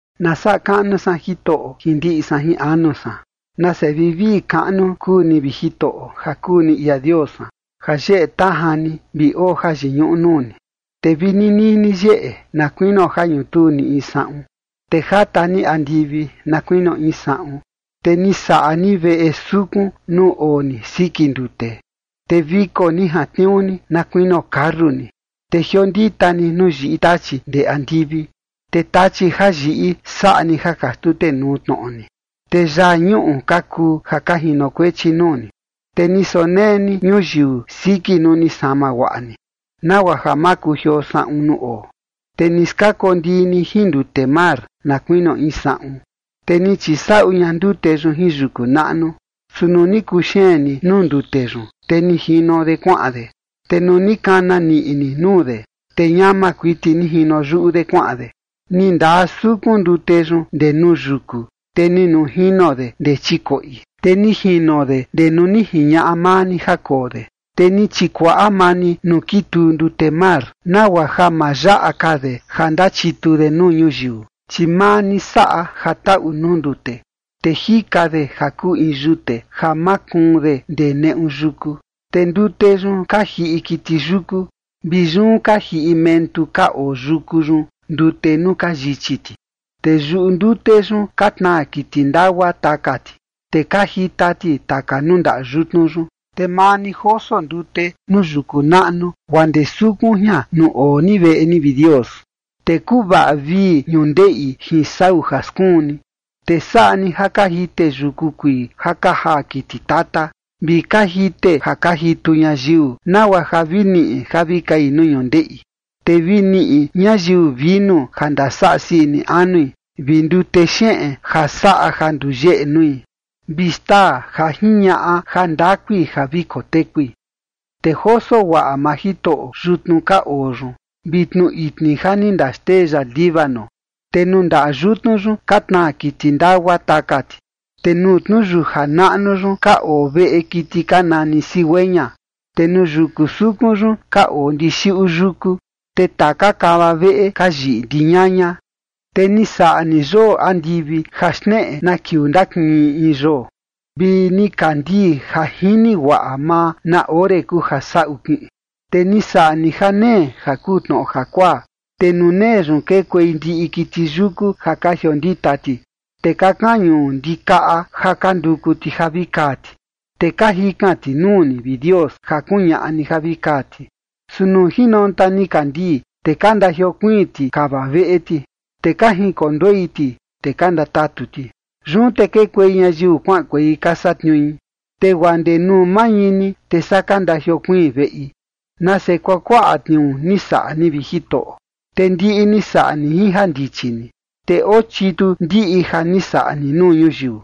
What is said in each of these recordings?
Na saꞌa kaꞌnu san Jitoꞌo jin ndiꞌi san jin anu san. Nase vivii kaꞌnu kuu ni, vi Jitoꞌo, ja kuu ni ia Dios san, ja yeꞌe tajan ni vi oo jayiñuꞌu nuu ni. Te vi ninii ni yeꞌe na kuinio ja ñutuu ni in saꞌun, te jata ni andivi na kuinio in saꞌun. Te ni saꞌa ni veꞌe sukun nuu oo ni siki ndute, te viko ni jantniuu ni na kuinio karreta ni, te jiondita ni nuu yiꞌi tachi ndee andivi. Te tachi ja yiꞌi, saꞌa ni ja ka xtutenuu tnoꞌo ni, te yaa ñuꞌu ka kuu ja ka jinokuechi nuu ni. Te ni sonee ni ñuyiu siki nuu ni sama guaꞌa ni, nagua ja ma kujioo saꞌun nuu oo. Te ni skakondii ni jin ndute mar na kuinio in saꞌun, te ni chisaꞌu ña ndute yun jin yuku naꞌnu. Su nuu ni kuxeen ni nuu ndute yun, te ni jino de kuaꞌan de, te nuu ni kana niꞌi ni nuu de, te ñama kuiti ni jino yuꞌu de kuaꞌan de. Ni ndaa sukun ndute yun ndee nuu yuku, te ni nujino de ndee chikoꞌi, te ni jino de ndee nuu ni jiñaꞌa maa ni ja koo de. Te ni chikuaꞌa maa ni nuu kituu ndute mar, nagua ja ma yaꞌa ka de ja ndachitu de nuu ñuyiu. Chi maa ni saꞌa ja taꞌu nuu ndute, te jika de ja kuu in yute ja makuun de ndee neꞌu yuku. Te ndute yun ka jiꞌi kiti yuku, vi yun ka jiꞌi mentu ka oo yuku yun ndute nuu ka yichi ti. Te yuꞌu ndute yun ka tnaa kiti ndagua taka ti, te ka jita ti taka nuu ndaꞌa yutnu yun. Te maa ni joso ndute nuu yuku naꞌnu guaa ndee sukun jian nuu oo ni veꞌe ni, vi Dios, te kuvaꞌa vii ñundeꞌi jin sau ja skuun ni. Te saꞌa ni ja ka jite yuku kuii ja ka jaa kiti tata, vi ka jite ja ka jitu ñayiu, nagua ja vi niꞌi ja vi kai nuu ñundeꞌi. Te vi niꞌi ñayiu vinu ja ndasaꞌa sii ini anui, vi ndute xeꞌen ja saꞌa ja nduyeꞌe nui, vi xtaa ja jiñaꞌa jandakui ja vi kotekui. Te joso guaꞌa maa Jitoꞌo yutnu ka oo yun vi tnu itni ja ni ndaxtee ya Líbano. Te nuu ndaꞌa yutnu yun ka tnaa kiti ndagua taka ti, te nuu tnuyuja naꞌnu yun ka oo veꞌe kiti ka nani cigüeña. Te nuu yuku sukun yun ka oo ndixiꞌu yuku, te taka kava veꞌe ka yiꞌi ndiñaña. Te ni saꞌa ni yoo andivi ja xneꞌe na kiuu ndakiꞌin in in yoo, vi nikandii ja jini guaꞌa maa na ore kuu ja saꞌu kiꞌin. Te ni saꞌa ni janee ja kuu tnoꞌo jakuaa, te nuu nee yun kekuei ndiꞌi kiti yuku ja ka jiondita ti. Te ka kañu ndikaꞌa ja ka nduku ti ja vi kaa ti, te ka jikan ti nuu ni, vi Dios, ja kuñaꞌa ni ja vi kaa ti. Su nuu jinonta nikandii, te ka ndajiokuiin ti kava veꞌe ti, te ka jinkonduei ti, te ka ndatatu ti. Yun te kekuei ñayiu kuaꞌankuei ka satniui, te guaa ndee nuu mañini, te saa ka ndajiokuiin veꞌi. Nase kuakuaꞌa tniuu ni saꞌa ni, vi Jitoꞌo, te ndiꞌi ni saꞌa ni jin jandichi ni, te oo chitu ndiꞌi ja ni saꞌa ni nuu ñuyiu.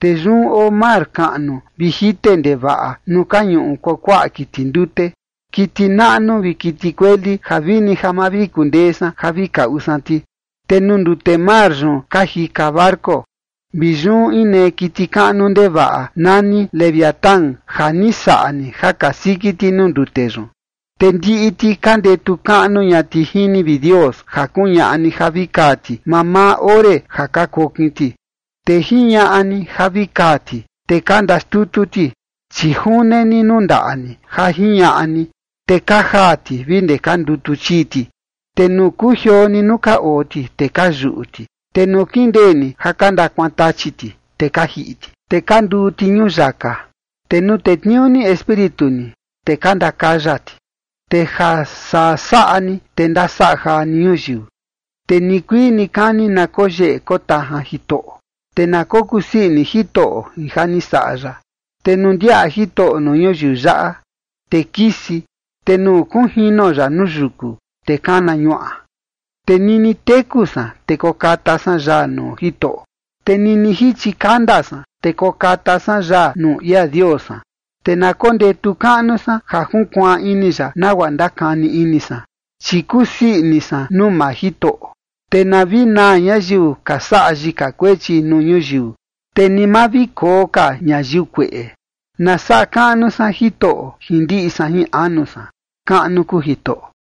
Te yun oo mar kaꞌnu vi jite ndevaꞌa nuu ka ñuꞌu kuakuaꞌa kiti ndute, kiti naꞌnu vi kiti kueli ja vini ja ma vi kundee san ja vi kaꞌu san ti. Te nuu ndute mar yun ka jika barco vi yun inee kiti kaꞌnu ndevaꞌa nani Leviatán ja ni saꞌa ni ja kasiki ti nuu ndute yun. Te ndiꞌi ti ka ndetu kaꞌnu ña ti jin ni, vi Dios, ja kuñaꞌa ni ja vi kaa ti mamaa ore ja ka kokin ti. Te jiñaꞌa ni ja vi kaa ti, te ka ndaxtutu ti, chi june ni nuu ndaꞌa ni ja jiñaꞌa ni, te ka jaa ti vi ndee ka ndutu chii ti. Te nuu kujioo ni nuu ka oo ti, te ka yuꞌu ti, te nuu kindee ni ja ka ndakuantachi ti, te ka jiꞌi ti, te ka nduu ti ñuyaka. Te nuu tetniuu ni Espíritu ni, te ka ndakaya ti, te ja saa saꞌa ni, te ndasaꞌa jaa ni ñuyiu. Te nikuii nikani na koyeꞌe kotajan Jitoꞌo, te na kokusii ini Jitoꞌo jin ja ni saꞌa ya. Te nuu ndiaꞌa Jitoꞌo nuu ñuyiu yaꞌa, te kisi, te nuu kunjino ya nuu yuku, te kana ñuaꞌa. Te nini teku san, te kokata san yaa nuu Jitoꞌo, te nini jichi kanda san, te kokata san yaa nuu ia Dios san. Te na kondetu kaꞌnu san ja junkuaan ini ya nagua ndakani ini san, chi kusii ini san nuu maa Jitoꞌo. Te na vi naa ñayiu ka saꞌa yika kuechi nuu ñuyiu, te ni ma vi koo ka ñayiu kueꞌe. Na saꞌa kaꞌnu san Jitoꞌo jin ndiꞌi san jin anu san. ¡Kaꞌnu kuu Jitoꞌo!